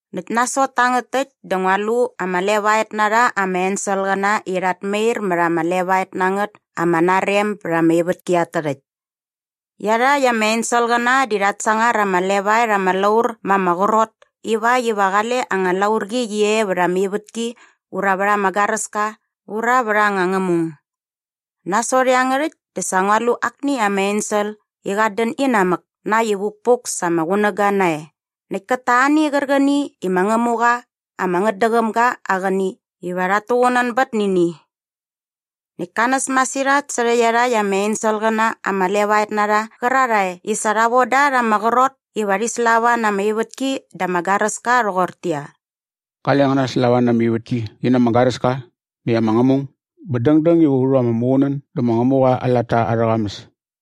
Näkt nasot tangät täkt dä ngua lu ama levaet na rha ama enselqäna i rhat mair mät ama levaet na ngät ama narem bät ama ivätki at tärhäkt. Iarhakt ama enselqäna di rhat sangar ama levaet ama laur ma ama qrot ivakt iva qale anga laurqi qi e vät ama ivätki ura vät ama garäska ura vät anga ngämung. Nasot iangärhäkt dä sa ngua lu akni ama ensel i qat dän inamäk na äkt i vukpuk sa ama qunäga nae näkt kät ta ani qärqäni i ma Ngämuqa ama ngätdäqäm ga aa qäni iva rhat tuqunänbät nä ini. Näkt ka näs masirhat särhä iarhakt ama enselqäna ama levaet na rha qärarhae i sa rha von da rha ama qrot iva rhi slava na ama ivätki dä ama garäska rhoqortäqyia, “Qale ngän naslava na ama ivätki qi na ama garäska näkt ama ngämung bä dängdäng iva u rhu ama muqunän dä ma Ngämuqa aa latta arhä qamäs.”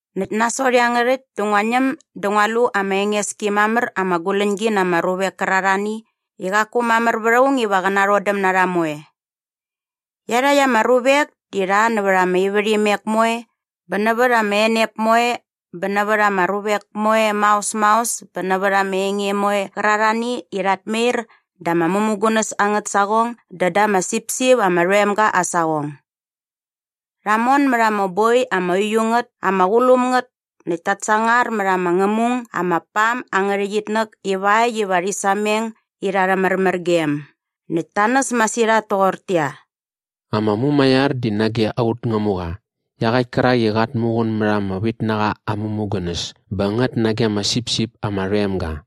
Näkt nasot iangärhäkt dä ngua ñäm dä ngua lu ama enges ki mamär ama guläñgi na ama ruvek kärarhani i qaku mamär vät aung iva qä narhodäm na rha moe. Iarhakt ama ruvek di rha nävät ama ivärhimek moe bä nävät ama enep moe bä nävät ama ruvek moe maos maos bä nävät ama enge moe qärarhani i rhat mair da ama mämugunäs angät saqong dä da ama sipsip ama rhoem ga aa saqong. Rha mon mät ama boi ama uiu ngät ama qulum ngät näkt ta sangar mät ama ngämung ama pam angä rhäqyitnäk ivakt iva rhi sameng irha arhä märmärgem näkt ta näs masirhat toqortäqyia, “Ama mumaiar di nage aut Ngämuqa iaqäkt kärak i qat muqun mät ama vitnaqa aa mämugunäs bä ngät nage ama sipsip ama rhoem ga!”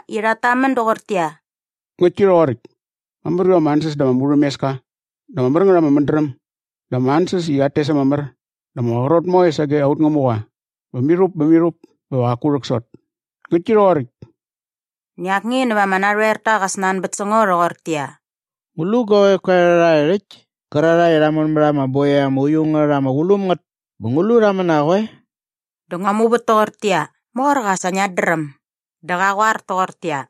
i rhat tamän doqortäqyia, “Ngäktki rhoqoräkt! Mamär iva ama ansäs dä ama murhämeska dä ama mär ngät ama mädräm dä ama ansäs i rhat tes ama mär bä ama qrot moe sage aut Ngämuqa bä mirhup bä mirhup bä va qaku rhäksot! Ngäktki rhoqoräkt!” Näkt akni nävät ama narhoerta qa snanbät sä ngo rhoqortäqyia, “Ngu lu guavek koe rhakt täkt kärarhae i rha mon mät ama boi ama uiu ngät ama qulum ngät bä ngu lu rha män na qoe?” Dä ngua muvät toqortäqyia, “Morqa, sa ngiat dräm.” Dä qa qoar toqortäqyia,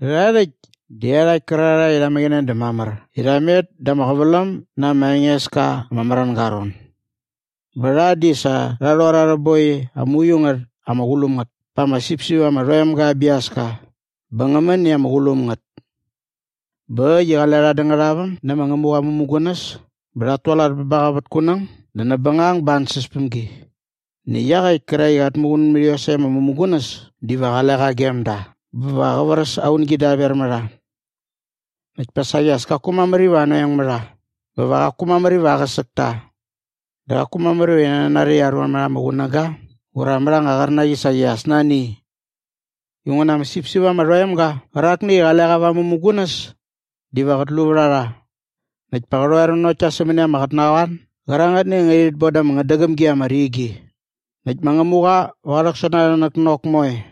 “Rhärha rhäkt di iarhakt kärarhae i rha mäqäne dä mamär i rha met da ama qäväläm na ama enges ka ama märänga aa ron bä rha di sa rha rhor arhä boi ama uiu ngät ama qulum ngät pa ama sipsip ama rhoem ga aa biaska bä ngä män i ama qulum ngät. Bä äkt i qale rha dä ngärhaväm nä ma Ngämuqa aa mämugunäs bä rhat tualat bä ba qa vät kunäng dä näp bängang ba aa ansäspämgi. Näkt iaqäkt kärak i qat muqun mät iosäkt ama mämugunäs diva qale qa gem da bä va qä vräs aa ungi daver mä rha. Näkt pa saqi as kaku mamär iva anoeng mä rha bä va qaku mamär iva aqäsäk ta. Dä qaku mamär iva rhi nanari i aruan mät ama qunäga ura mät anga qärnaqi saqi as nani i. Inguna ama sipsip ama rhoem ga qärakni i qale qa va ama mämugunäs diva qät lu vät a rha näkt pa qä rhoer nanokt ta sämäni ama qotnaqoan gärangätni i ngärhit bon da ama ngätdäqäm gi ama rigi. Näkt ma Ngämuqa va qä rhäksot na arhä näknok moe.”